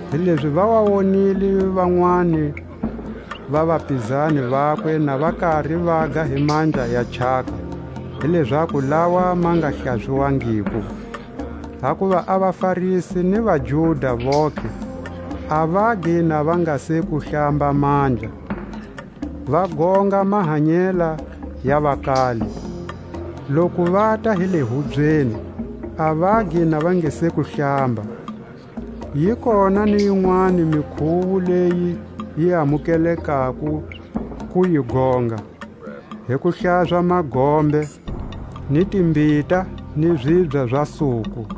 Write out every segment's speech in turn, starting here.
hilezi va wa wonile vanwani va vapizani vakwe na va kari vaga hi mandla ya chaka, hi lezaku lawa ma nga hlaziwangiko. Hakuva a vaFarisi ni vaJuda vontlhe, a vagi na va nga se ku hlamba mandla; va gonga mahanyela ya vakale. Loku vata hi le hubyeni, a vagi na va nga se ku hlamba; yi kona ni yinweni mikhuwo leyi va yi amukeleko ku yi gonga: hi ku hlaza magombe, ni timbita, ni zibya za suku,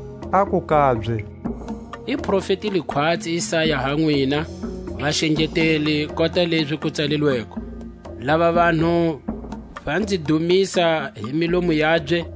Aku kabye: I profetile khwatsi Isaya ha nwina, vaxengeteli, kota lezi ku tsalilweko: Lava vanhu va nzi dumisa hi milomu yabye,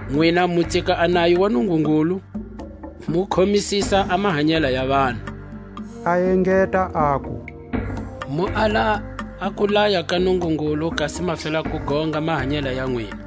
Nwina mu tsika a nayo wa Nungungulu, mu khomisisa a mahanyela ya vanhu. A engeta aku: Mu ala a kulaya ka Nungungulu, kasi ma fela ku gonga mahanyela ya nwina.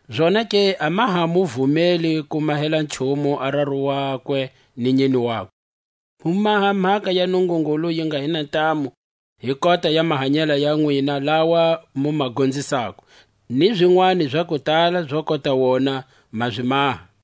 Zonake a ma ha mu vumeli ku mahela nchumu a raru wakwe ni nyine wakwe; mu maha a mhaka ya Nungungulu yi nga hi na ntamu hi kota ya mahanyela ya nwina lawa mu ma gonzisako; ni zinwani za kutala zo kota wona ma zi maha.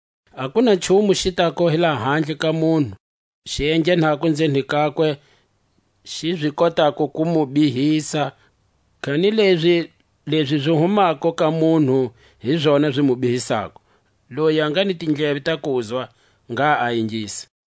A ku na nchumu xi tako hi lahandle ka munhu, xi enghenako nzeni kakwe, xi zi kotako ku mu bihisa; kanilezi lezi zi humako ka munhu, hi zona zi mu bihisako. Loyi a nga ni tindleve ta kuzwa, ngha a ingisa.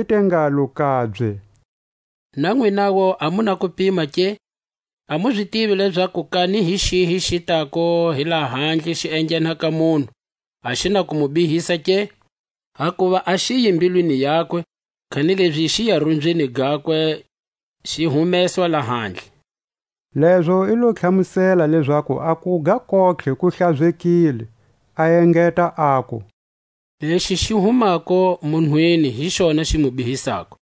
I te ngalo kabye: Na nwinawu a mu na kupima ke? A mu zi tivi lezaku kani hi xihi xi tako hi lahandle xi enghena ka munhu, a xi na ku mu bihisa ke? Hakuva a xiyi mbilwini: yakwe, kanilezi xiya rumbyini gakwe, xi humeswa lahandle. Lezo i lo tlhamusela lezaku a kuga kontlhe ku hlazekile. A engeta aku: Lexi xi humako munhwini hi xona xi mu bihisako;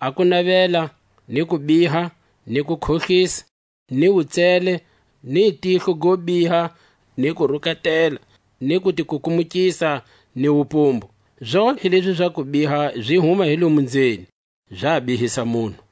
a kunavela, ni kubiha, ni kukhohlisa, ni wutsele, ni tihlo go biha, ni kurukatela, ni kutikukumukisa, ni wupumbu; zontlhe lezi za kubiha zi huma hi lomo nzeni, za bihisa munhu.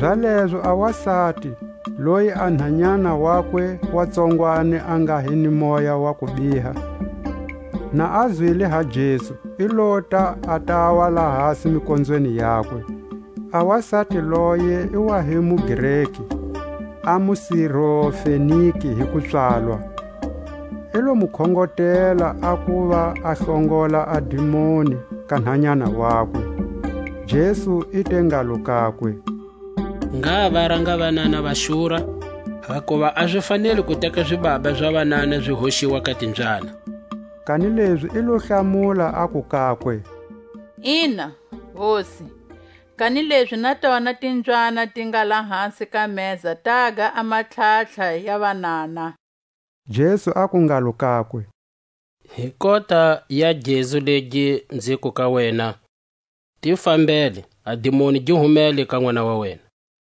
Zalezo a wasati, loyi a nhanyana wakwe wa tsongwani a nga hi ni moya wa kubiha, na a zwile ha Jesu, i lota a tawa lahasi mikonzweni yakwe. A wasati loye i wa hi muGreki, a muSirofenike hi kupswalwa. I lo mu khongotela a kuva a hlongola a dimoni ka nhanyana wakwe. Jesu i te ngalo kakwe: Ngha va ranga vanana va xura; hakuva a zi faneli ku teka zibaba za vanana zi hoxiwa ka timbyana. Kanilezi i lo hlamula aku kakwe: Ina, Hosi, kanilezi na tona timbyana ti nga lahasi ka meza taga a matlhatlha ya vanana. Jesu aku ngalo kakwe: Hi kota ya gezu legi nziku ka wena, ti fambele; a dimoni gi humele ka nʼwana wa wena.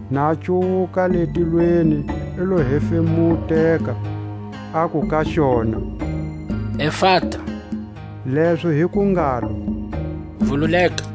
na cuwuka le tilweni i lo hefemuteka, aku ka xona: Efata, lezo hi ku ngalo: Vululeka!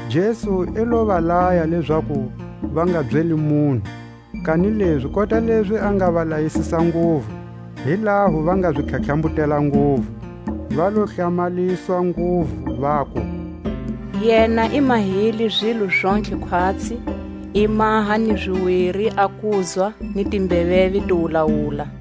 Jesu i lo va laya lezaku va nga byeli munhu; kanilezi kota lezi a nga va layisisa nguvu, hi laho va nga zi tlhatlhambutela nguvu. Va lo hlamaliswa nguvu, vaku: Yena i mahile zilo zontlhe khwatsi: i maha ni ziwiri a kuzwa ni timbeveve ti wulawula.